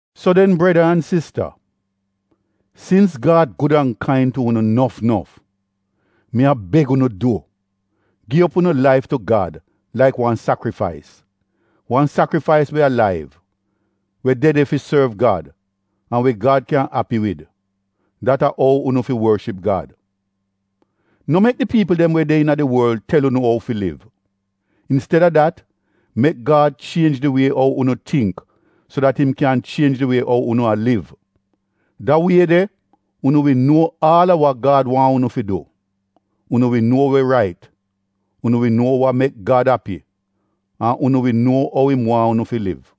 So den breda an sista, sins Gad gud an kain tu unu nof nof, mi a beg unu du, gi op unu laif tu Gad laik wan sakrifais — wan sakrifais we alaiv, we de de fi sorv Gad an we Gad kyan api wid. Dat a ou unu fi worship Gad. No mek di piipl we de iina di worl tel unu ou fi liv. Insteda dat mek Gad chienj di wie ou unu tingk so dat im kyan chienj di wie ou unu a liv. Da wie de unu wi nuo aal a wa Gad waahn unu fi du — unu wi nuo we rait, unu wi nuo wa mek Gad api an unu wi nuo ou im waahn unu fi liv.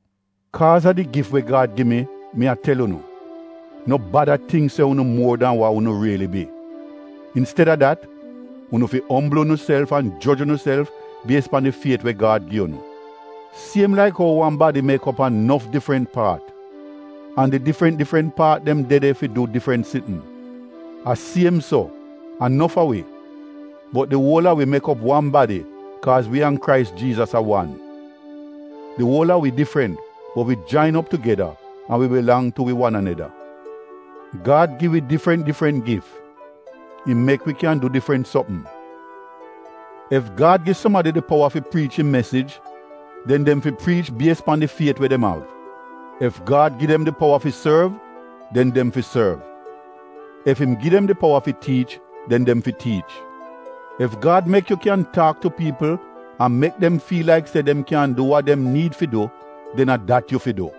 Kaaz a di gif we Gad gi mi, mi a tel unu: No bada tingk se unu muor dan wa unu riili bi. Insteda dat unu fi ombl unuself an joj unuself bies pan di fiet we Gad gi unu. Siem laik ou wan badi mek op a nof difrant paat, an di difrant difrant paat dem de de fi du difrant sitn, a siem so, a nof a wi, bot di uol a wi mek op wan badi kaaz wi an Krais Jiizas a wan. Di uol a wi difrant bot wi jain op tugeda an wi bilang tu wi wan aneda. Gad gi wi difrant difrant gif — im mek we kyan du difrant sopm. Ef Gad gi sumadi di powa fi priich im mesij, den dem fi priich bies pan di fiet we dem av. Ef Gad gi dem di powa fi sorv, den dem fi sorv. Ef im gi dem di powa fi tiich den dem fi tiich. Ef Gad mek yu kyan taak tu piipl an mek dem fiil laik se dem kyan du wa dem niid fi du, den a dat yu fi du.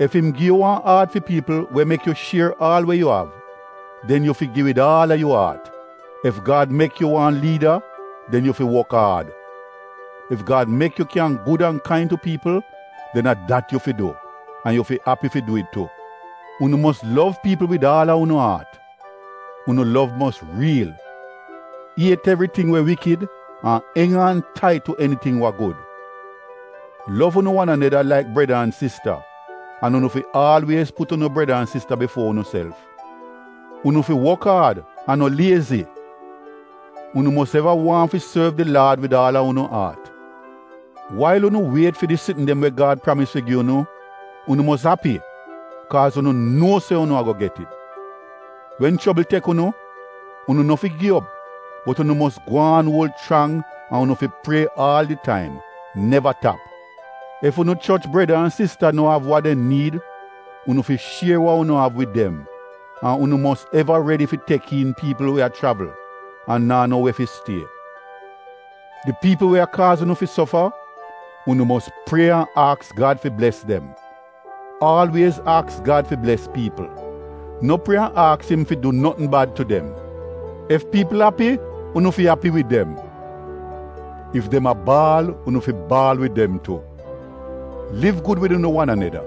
Ef im gi yu wan aat fi piipl we mek yu shier aal we yu av, den yu fi gi wid aal a yu aat. Ef Gad mek yu wan liida, den yu fi wok aad. Ef Gad mek yu kyan gud an kain tu piipl, den a dat yu fi du an yu fi api fi du it tu. Unu mos lov piipl wid aal a unu aat — unu lov mos riil; iet evriting we iivl an eng aan tait tu eniting wa gud. Lov unu wan aneda laik breda an sista an unu fi aalwiez put unu breda an sista bifuo unuself. Unu fi wok aad an no liezi! Unu mos eva waahn fi sorv di Laad wid aal a unu aat. Wail unu wiet fi di sitn dem we Gad pramis fi gi unu, unu mos api kaaz unu nuo se unu ago get it. Wen chobl tek unu, unu no fi gi op bot unu mos gwaan uol chrang an unu fi prie aal di taim, neva tap. Ef unu choch breda an sista no av wa dem niid, unu fi shier wa unu av wid dem an unu mos eva redi fi tek iin piipl we a chravl an naa no we fi stie. Di piipl we a kaaz unu fi sofa, unu mos prie an aks Gad fi bles dem; aalwiez aks Gad fi bles piipl, no prie an aks im fi du notn bad tu dem. Ef piipl api unu fi api wid dem, ef dem a baal unu fi baal wid dem tu. Liv gud wid unu wan aneda.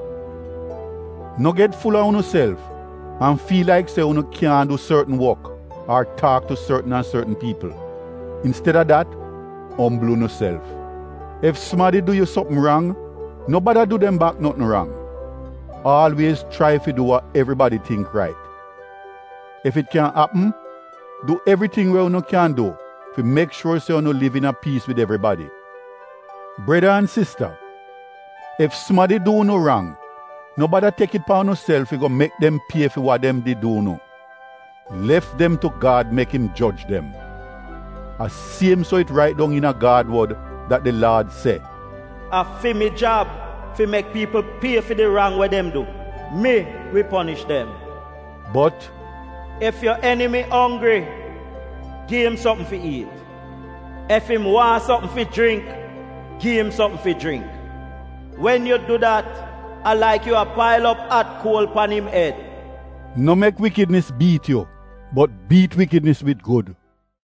No get ful-a unuself an fiil laik se unu kyaahn du sortn wok ar taak tu sortn an sortn piipl. Insteda dat ombl unuself. Ef sumadi du yu sopm rang, no bada du dem bak notn rang; aalwiez chrai fi du wa evribadi tingk rait. Ef it kyan apm, du evriting we unu kyan du fi mek shuor se unu liv iina piis wid evribadi. Breda an sista ef sumadi du unu rang no bada tek it pan unuself fi go mek dem pie fi wa dem did du unu, lef dem tu Gad mek im joj dem. A siem so it rait dong iina Gad wod dat di Laad se, “A fi mi jab fi mek piipl pie fi di rang we dem du, mi wi ponish dem.” Bot, “Ef yu enimi onggri, gi im sopm fi iit; ef im waahn sopm fi jringk, gi im sopm fi jringk. Wen yu du dat, a laik yu a pail op at kuol pan im ed.” No mek iivl biit yu bot biit iivl wid gud.